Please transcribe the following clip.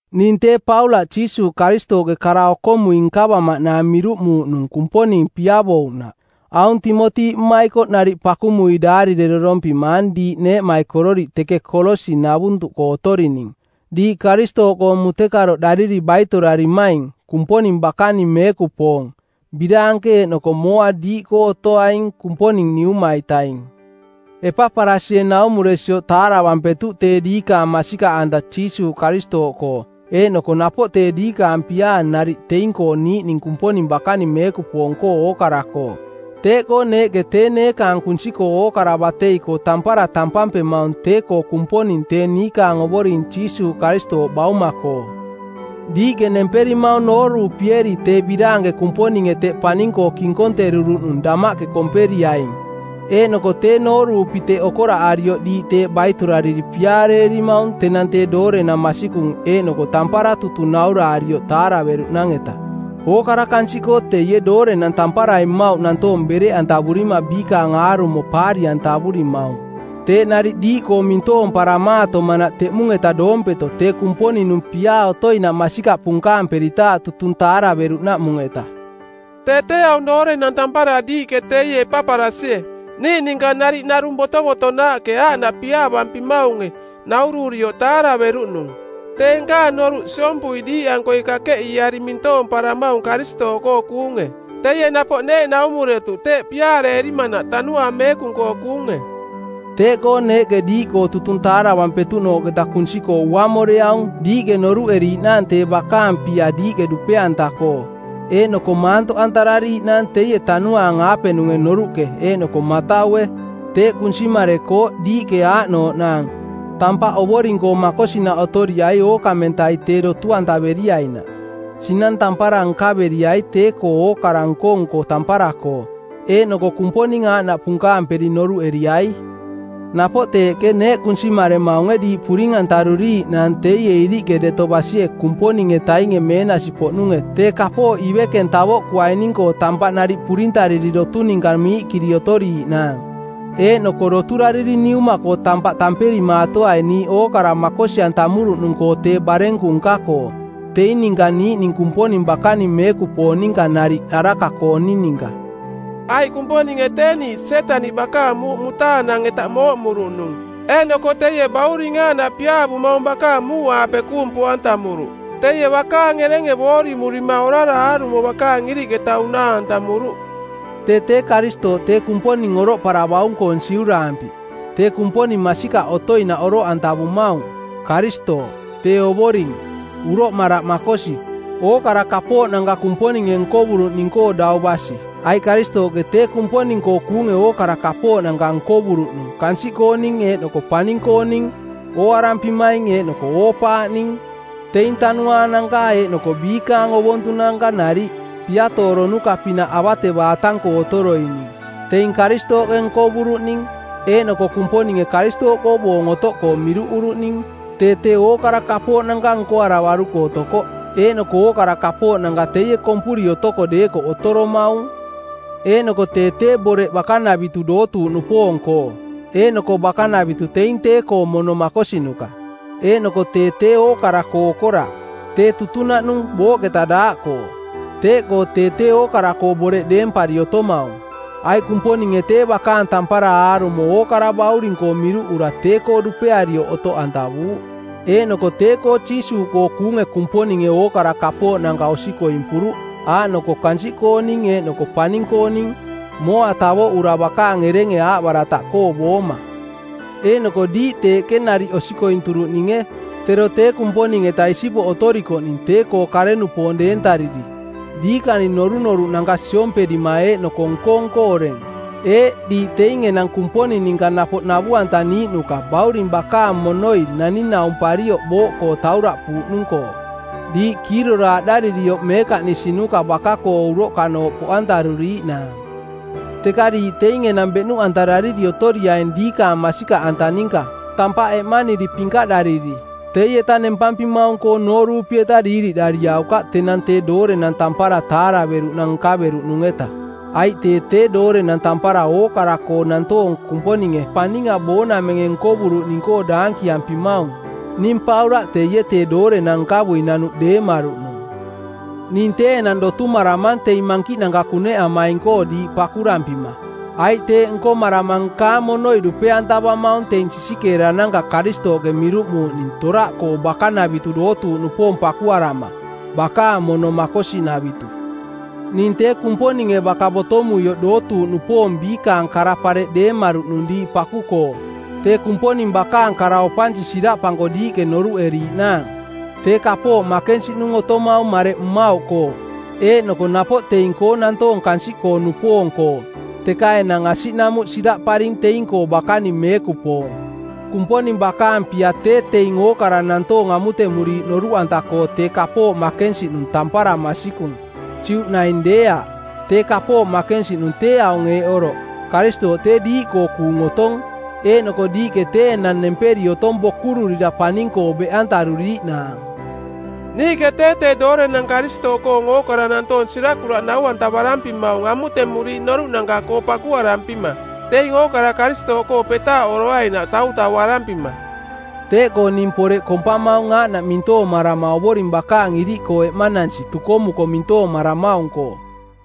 Ning tee Paulaꞌ Jiisuuꞌ Karistooꞌke kara okomui nkavamaꞌnaang miruꞌmuuꞌnung Kumponing piavouꞌnaꞌ. Aung Timoti mmaikoꞌ nariꞌ pakumui daarirerorompimang diiꞌ neeꞌmaikororiꞌ teke Kolosi-navuntuꞌkoo otorining, diiꞌ Karistooꞌkoo mutekaroꞌdariri baitorarimaing, Kumponing bakaning meekupoong; Biraanke eeꞌnoko mooa diiꞌkoo otoaing Kumponing Niuma-itaing. Epaparasie naumuresioꞌ taaravampetuꞌ tee diikaang masikaꞌanta Jiisuuꞌ Karistooꞌkoo eeꞌnoko napoꞌ tee diikaang piaa nariꞌ teing-koo niiꞌning Kumponing bakaning meekupoong-koo ookara-koo. Teeꞌkoo neeꞌke tee neekaang kunsi-koo ookara batei-koo tampara tampampemaung tee-koo Kumponing tee niikaang Ovoring Jiisuuꞌ Karistooꞌ Bauma-koo. Diiꞌke nemperimaung nooruupieri tee biraanke Kumponinge teꞌ paning-koo kinkonteruruꞌnung damaꞌke komperiaing, eeꞌnoko tee nooruupi teꞌ okoraꞌarioꞌ diiꞌ teeꞌ baitorariri piaareerimaung tenang tee doorenang masikung eeꞌnoko tampara tutung nauraarioꞌ taaraveruꞌnang-eta. Ookara kansiꞌkoo teie doorenang tamparai mmauꞌ nantoong bereꞌantavurima biikaang aarumo paari-antavurimaung teeꞌ nariꞌ diiꞌkoo mintoomparamaatomanaꞌ teꞌmung-eta doompeto tee Kumponing-nung piaa otoinaꞌ masikaꞌ punkaamperitaaꞌ tutung taaraveruꞌnaꞌmung-eta. Tee tee aung doorenang tampara diiꞌke teie Epaparasie, niiꞌ ninka nariꞌ narung botovotonaaꞌke aaꞌnaꞌ piaavampimaunge, naururioꞌ taaraveruꞌnung, tee nkaang noruꞌ siompui diiꞌankoi kakeꞌiiari mintoomparamaung Karistooꞌkoo kuunge. Teie napoꞌ neeꞌ naumuretuꞌ teeꞌ piaareerimanaꞌ Tanuaang Meekung-koo kuunge. Teeꞌkoo neeꞌke diiꞌkoo tutung taaravampetuꞌnooꞌketa kunsi-koo uaamoreaung diiꞌke noruꞌeriiꞌnaang tee bakaang pia diiꞌke dupe-anta-koo, eeꞌnoko maantoꞌantarariiꞌnaang teie Tanuaang-aapenung noruꞌke eeꞌnoko mataue. Teeꞌ kunsimarekooꞌ diiꞌke aaꞌnooꞌnaang: tampaꞌ Ovoring-koo makosinaꞌ otoriai ookamentai tee dotu-antaveriainaꞌ, sinang tampara nkaveriai tee-koo ookara nko-nko tampara-koo, eeꞌnoko Kumponing aaꞌnaꞌ punkaamperi˜ noruꞌeriai. Napoꞌ teeꞌke neeꞌ kunsimaremaunge diiꞌ puring-antaruriiꞌnaang teie iriꞌke deto basie Kumponing-etainge meenasi-poꞌnunge tee kapooꞌ ivekeng tavoꞌkuaining-koo tampaꞌ nariꞌ purintariri dotu ninka miiꞌkiri otoriiꞌnaang. Eeꞌnoko doturariri Niuma-koo tampaꞌ tamperimaatoai niiꞌ ookara makosi-antamuruꞌnung-koo tee barenku nka-koo, teing ninka niiꞌning Kumponing bakaning meekupoong ninka nariꞌ araka-kooning ninka. Aiꞌ Kumponinge tee niiꞌ Sietaniꞌ bakaang muuꞌ mutaanang-eta mooꞌmuruꞌnung eeꞌnoko teie Bauring aaꞌnaꞌ piaavumaung bakaang muuꞌaape kuung poꞌantamuruꞌ. Teie bakaang erenge boorimurima orara aarumo bakaang iriꞌketa unaa-antamuruꞌ. Tee tee Karistooꞌ tee Kumponing oroꞌparavaung-koong siuraampi˜ tee Kumponing masikaꞌ otoinaꞌ oroꞌantavumaung, Karistooꞌ, tee Ovoring, uroꞌmaraꞌ makosi, ookara kapooꞌnanka Kumponinge nkovuruꞌning-koo dau basi. Aiꞌ Karistooꞌke tee Kumponing-koo kuunge ookara kapooꞌnanka nkovuruꞌnung kansiꞌ kooning eeꞌnoko paning-kooning, ooarampimaing eeꞌnoko oo-paaꞌning, teing tanuaananka eeꞌnoko biikaang ovontunanka nariꞌ, piatooronuka˜ pinaꞌ avatevaatang-koo otoroining. Teing Karistooꞌke nkovuruꞌning, eeꞌnoko Kumponinge Karistooꞌkoo boong otoꞌkoo miruꞌuruꞌning. Tee tee ookara kapooꞌnanka nkoaravaruko otokoꞌ, eeꞌnoko ookara kapooꞌnanka teie kompuri otoko deekoꞌ otoromaung. Eeꞌnoko tee tee boreꞌ bakanavitu dootuuꞌnupoong-koo. Eeꞌnoko bakanavitu teing tee-koong mono makosinuka. Eeꞌnoko tee tee ookara-koo okoraꞌ. Tee tutunaꞌnung booꞌketa daaꞌkoo. Teeꞌkoo tee tee ookara-koo boreꞌ deempari otomaung. Aiꞌ Kumponinge tee bakaang tampara aarumo ookara Bauring-koo miruꞌura tee-koo dupearioꞌ otoꞌantavuuꞌ. Eeꞌnoko tee-koo Jiisuuꞌkoo kuunge Kumponinge ookara kapooꞌnanka osikoimpuruꞌ, aaꞌnoko kansiꞌkooning eeꞌnoko paning-kooning, mooa tavoꞌura bakaang erenge aaꞌbarataꞌkoo booma. Eeꞌnoko diiꞌ teeꞌke nariꞌ osikointuruꞌninge, tero tee Kumponing-eta isipoꞌ otorikoꞌning tee-koo kare-nupoong deentariri, diikaning norunoruꞌnanka siomperima eeꞌnoko nko-nko oreng. Eeꞌ diiꞌ teing enang Kumponing ninka napoꞌ navu-antaniiꞌnuka bauring bakaang monoi naning-naumparioꞌ booꞌkoo tauraꞌpuuꞌnung-koo, diiꞌ kiiroraaꞌdaririoꞌ meekaꞌnisinuka baka-koo uroꞌkanooꞌ poꞌantaruriiꞌnaang. Teka diiꞌ teing enang beꞌnuꞌantarariri otoriaing diikaang masikaꞌanta ninka, tampaꞌ eꞌmaniri pinkaꞌdariri. Teieta nempampimaung-koong noorupi-eta diiriꞌdariaukaꞌ tenang tee doorenang tampara taaraveruꞌnang nkaveruꞌnung-eta. Aiꞌ tee tee doorenang tampara ookara-koo nantoong Kumponinge paninga boonamenge nkovuruꞌning-koo daankiampimaung. Ning Paulaꞌ teie tee doorenang nkavui nanuꞌ deemaruꞌnung. Ning tee enang dotumaramang teing mankiꞌnanka kuneꞌamaing-koo diiꞌ pakurampima, aiꞌ teeꞌ nkomarama nkaang monoi dupe-antavamaung teing sisikeerananka Karistooꞌke miruꞌmuuꞌning toraꞌkoo bakanavitu dootuuꞌnupoong pakuarama, bakaang mono makosinavitu. Ning tee Kumponinge baka botomuioꞌ dootuuꞌnupoong biikaang kara-pareꞌ deemaruꞌnung diiꞌ paku-koo, tee Kumponing bakaang kara opansi siraꞌpanko diiꞌke noruꞌeriiꞌnaang. Tee kapooꞌ makensiꞌnung otomaung mareꞌ mmauꞌkoo eeꞌnoko napoꞌ teing-koo nantoong kansiꞌkoo-nupoong-koo, teka enang asiꞌnamuꞌ siraꞌparing teing-koo bakaning meekupoong. Kumponing bakaang pia tee teing ookara nantoong amutemuriiꞌ noruꞌanta-koo tee kapooꞌ makensiꞌnung tampara masikung, Juꞌ naing deeaꞌ. Tee kapooꞌ makensiꞌnung tee aung eeꞌ oroꞌ, Karistooꞌ tee diiꞌkoo kuung otong eeꞌnoko diiꞌke tee enang nemperi otong bokururira paning-koo beꞌantaruriiꞌnaang. Niiꞌke tee tee doorenang Karistooꞌkoong ookara nantoong sirakuraꞌ nau-antavarampimaung amutemuriiꞌ noruꞌnanka-koo pakuarampima, teing ookara Karistooꞌkoo petaaꞌoroainaꞌ tautauarampima. Teeꞌkoo ning poreꞌ kompamaung aaꞌnaꞌ mintoomarama Ovoring bakaang iriꞌkoo eꞌmanansi tukomuko mintoomaramaung-koo.